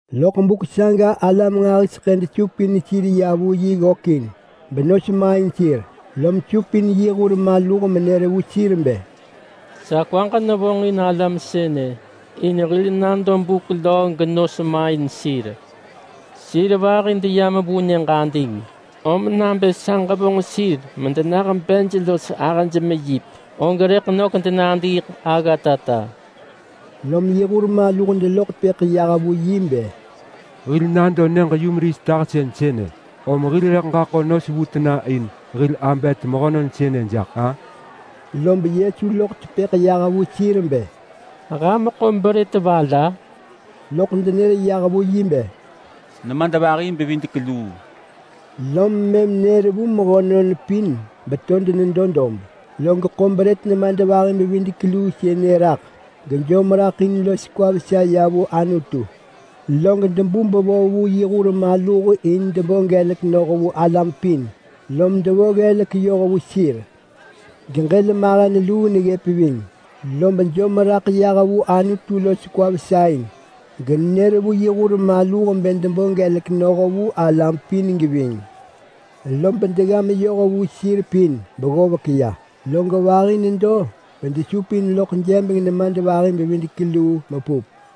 Loḳ buk saga alam nġahiseḳë desupin sir ya vu yi ggökin benos main sir, lom supin yi hur maluh menër vu sir bë, “Sa kwaġ nevonġin alam sënë in hil nado buk löö genos main sir. Sir vahi deyam vu nyëġ ading, om nabë sa ġevonġ sir medenah bej los ahëj meyip, og rëḳ nök denadiiḳ aggatata.” Lom yi hur maluh deloḳ tepëḳ yah vu yi bë, “Hil nado nyëġ-yumeris tahsën sënë, om hil rëḳ ġaḳo nos vu tena in hil abet mehönon sënë jaḳ-a?” Lob Yesu loḳ tepëḳ yah vu sir bë, “Ham ḳo brët va la?” Loḳ denër yah vu yi bë, “Nemadvahi-bevidek-luu!” Lom mëm nër vu mehönon pin beto denedo dob, log ḳo brët nemadvahi-bevidek-luu sënë raḳ gejom raḳ in los kwa vesa ya vu Anutu, log debu bevo vu yi hur maluh in bë debo gelek noh vu alam pin, lom mëm devo ggelek yoh vu sir. Geġël mahen luu neggëp ving, lob nejom raḳ yah vu Anutu los kwa vesa in, genër vu yi hur maluh bë debo gelek noh vu alam pin geving. Lob degga meyoh vu sir pin beggovek ya, log vahi nedo bedesupin loḳ jebeng nemadvahi-bevidek-luu mepup.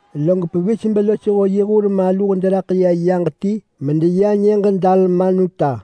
log pevis belosho yi hur maluh deraḳ ya yaġ ti medeya nyëġ Dalmanuta.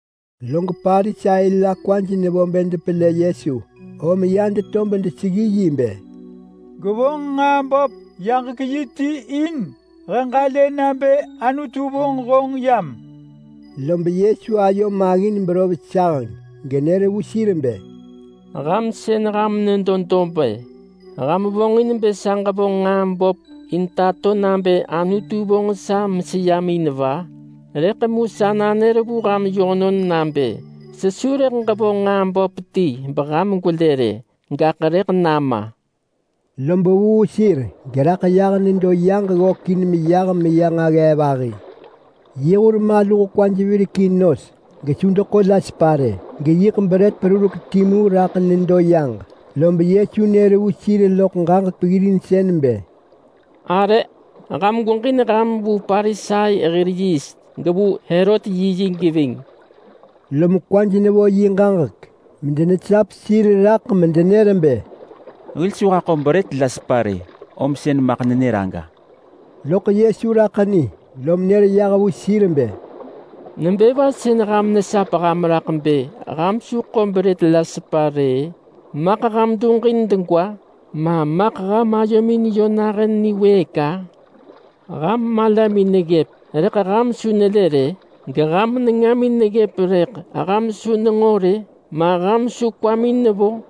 Lob Parisai la kwaj nevo bë depelë Yesu, lom ya deto vu bedeseggi yi bë, “Gwevonġ nġaa böp yaġek yi ti in he ġalë nabë Anutu vonġ honġ yam!” Lob Yesu ayo maggin berov saheng genër vu sir bë, “Ham sën ham nedo dob-ë, ham vonġin bë sa ġevonġ nġaa böp in bë tato nabë Anutu vonġ sa meseyam in va? Rëḳ mu sa nanër vu ham yönon nabë sesu rëḳ ġevonġ nġaa böp ti beham gwelë rë, gaḳ rëḳ nama!” Lob vuu sir geraḳ yah nedo yaġ ggökin meyah meya nġaggee vahi. Yi hur maluh kwaj virekin nos gesu deḳo la sepa rë, geyiḳ brët perurek timu raḳ nedo yaġ. Lob Yesu nër vu sir loḳ ġaġek peggirinsën bë, “Arë! Ham gweġin ham vu Parisai hir yiist, gevu Herot yiyi geving.” Lom kwaj nevo yi ġaġek medenesap sir raḳ medenër vu sir bë, “Hil su haḳo brët la sepa rë, om sën maḳ nenër aga!” Loḳ Yesu raḳ ni, lom nër vu sir bë, “Nebë va sën ham nesap ham raḳ bë ham su ḳo brët la sepa rë-ë? Maḳ ham duġin degwa? Ma maḳ ham ayomin yö nahën niwëëk-a? Ham malamin neggëp rëḳ ham su nelë rë? Geham nengamin neggëp rëḳ ham su nenġo rë? Ma ham su kwamin nevo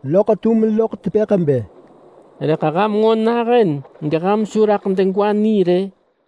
Loḳ tum loḳ tepëḳ bë, “Rëḳ ham nġo nahën geham su raḳ degwa ni rë?”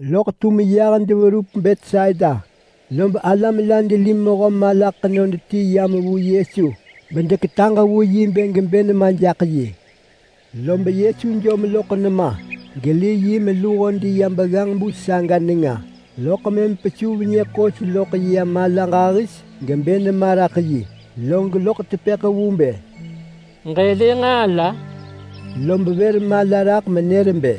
Loḳ tum yah deverup Betsaida, lob alam la deli mehö mala ḳenod ti yam vu Yesu bedeketaġ vu yi bë gebë nema jaḳ yi. Lob Yesu jom loḳ nema geli yi meluho deya begganġ telig nenga, loḳ mëm pesuv nyë ḳos loḳ ya mala ġahis gebë nema raḳ yi, log loḳ tepëḳ vu nebë, “Ġëlë nġaa la?” Lob vër mala raḳ menër bë,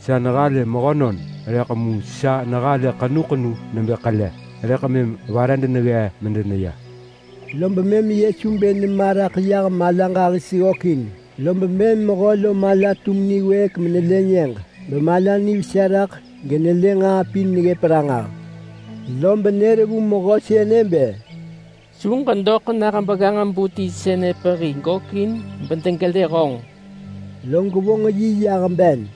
“Sa nehalë mehönon, rëḳ mu sa halë ahëj ḳenu nebë ḳele, rëḳ mëm vare deneggee medeneya!” Lob mëm Yesu bë nema raḳ yah mala ġahis ggökin, lob mëm mehö lo mala tum niwëëk menelë nyëġ, bemala nivesa raḳ genelë nġaa pin neggëp ranġah. Lob nër vu mehö sënë bë, “Su ġedoḳ nah begganġ-bu ti sënë pehi gökin bedegelë honġ!” Log vonġ yi yah ben.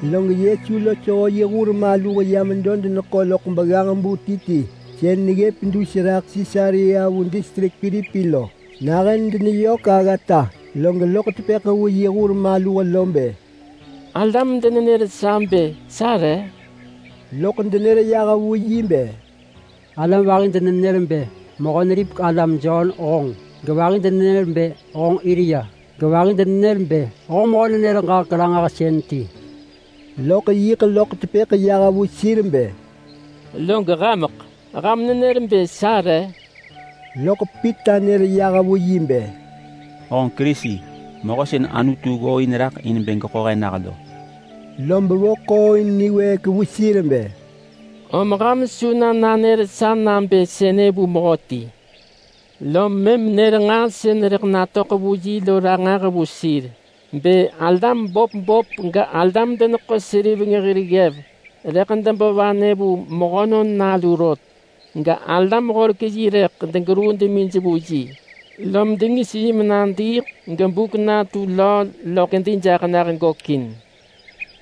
Log Yesu losho yi hur maluh ya medo deneḳo loḳ begganġ-bu ti ti sën neggëp dus raḳ Sisarea vu distrik Pilipi lo. Nahën deneyök aggata log loḳ tepëḳ vu yi hur maluh bë, “Alam denenër sa bë sa re?” Loḳ denër yah vu yi bë, “Alam vahi denenër bë Mehö-neripek-alam Jon honġ, gevahi denenër bë honġ Elia, gevahi denenër bë honġ mehö-nenër-ġaġek-ranġahsën wirek hen ti!” Loḳ yiḳ loḳ tepëḳ yah vu sir bë, “Log hameḳ? Ham nenër bë sa re?” Loḳ Pita nër yah vu yi bë, “Honġ Kerisi. Mehö sën Anutu ggooin raḳ in bë geḳo he nah lo.” Lob vo ḳooin niwëëk vu sir bë, “Om ham su na nanër sa nabë sënë vu mehöti!” Lob mëm nër nġaa sën rëḳ natöḳ vu yi lo ranġah vu sir bë alam böp böp galam-deneḳo-seriveng hir ggev rëḳ debo vanë vu Mehönon Nalu rot, galam-horek-yi rëḳ degeruu demij vu yi, lob dengis yi menadiiḳ gebuk natu löö loḳ kedi jaḳ nah gökin.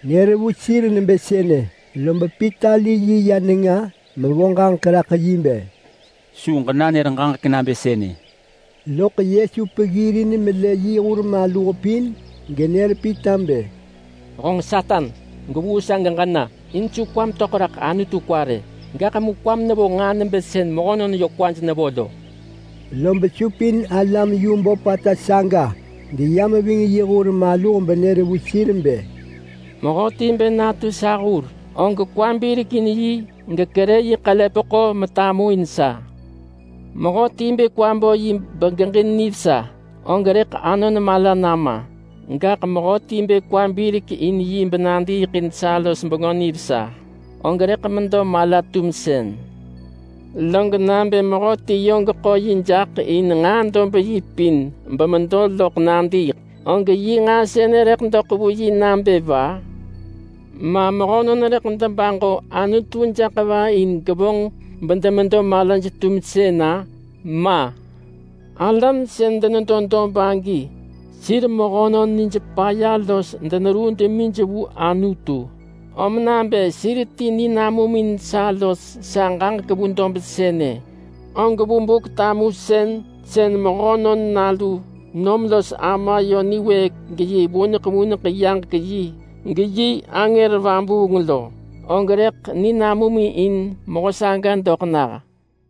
Nenër vu sir nebë sënë, lob Pita li yi meya nenga mevonġ ġaġek raḳ yi bë, “Su ġenanër ġaġek nabë sënë!” Loḳ Yesu peggirin melë yi hur maluh pin, genër Pita bë, “Honġ Satan! Gwevuu sa geġena! In su kwam töḳ raḳ Anutu kwa rë, gaḳ mu kwam nevo nġaa nebë sën mehönon yö kwaj nevo lo.” Lob supin alam yu böpata saga deyam ving yi hur maluh benër vu sir bë, “Mehöti bë natu sa hur, og kwa birekin yi gekerë yi ḳelepeḳo metamuin sa. Mehöti bë kwa bo yi begeġin nivesa, og rëḳ anon mala nama, gaḳ mehöti bë kwa birek in yi benadiiḳ in sa los Bengö Nivesa, og rëḳ medo mala-tumsën. Gaḳ nabë mehöti yö geḳo yi jaḳ in nġaa dob yi pin bemedo loḳ nadiiḳ, og yi nġaa sënë rëḳ doḳ vu yi nabë va? Ma mehönon rëḳ debaġo Anutu jaḳ va in gevonġ bedemedo malaj-tumsën-a? Ma! Alam sën denedo dob agi sir mehönon nij paya los deneruu demij vu Anutu, om nabë sir ti ninamum in sa los sa ġaġek vu dob sënë, og vu Buk-tamusën sën Mehönon Nalu nom los Ama yö niwëëk geyi vuneḳ vuneḳ yaġek yi geyi angër vabuung lo, og rëḳ ninamum in mehö saga doḳ nah.”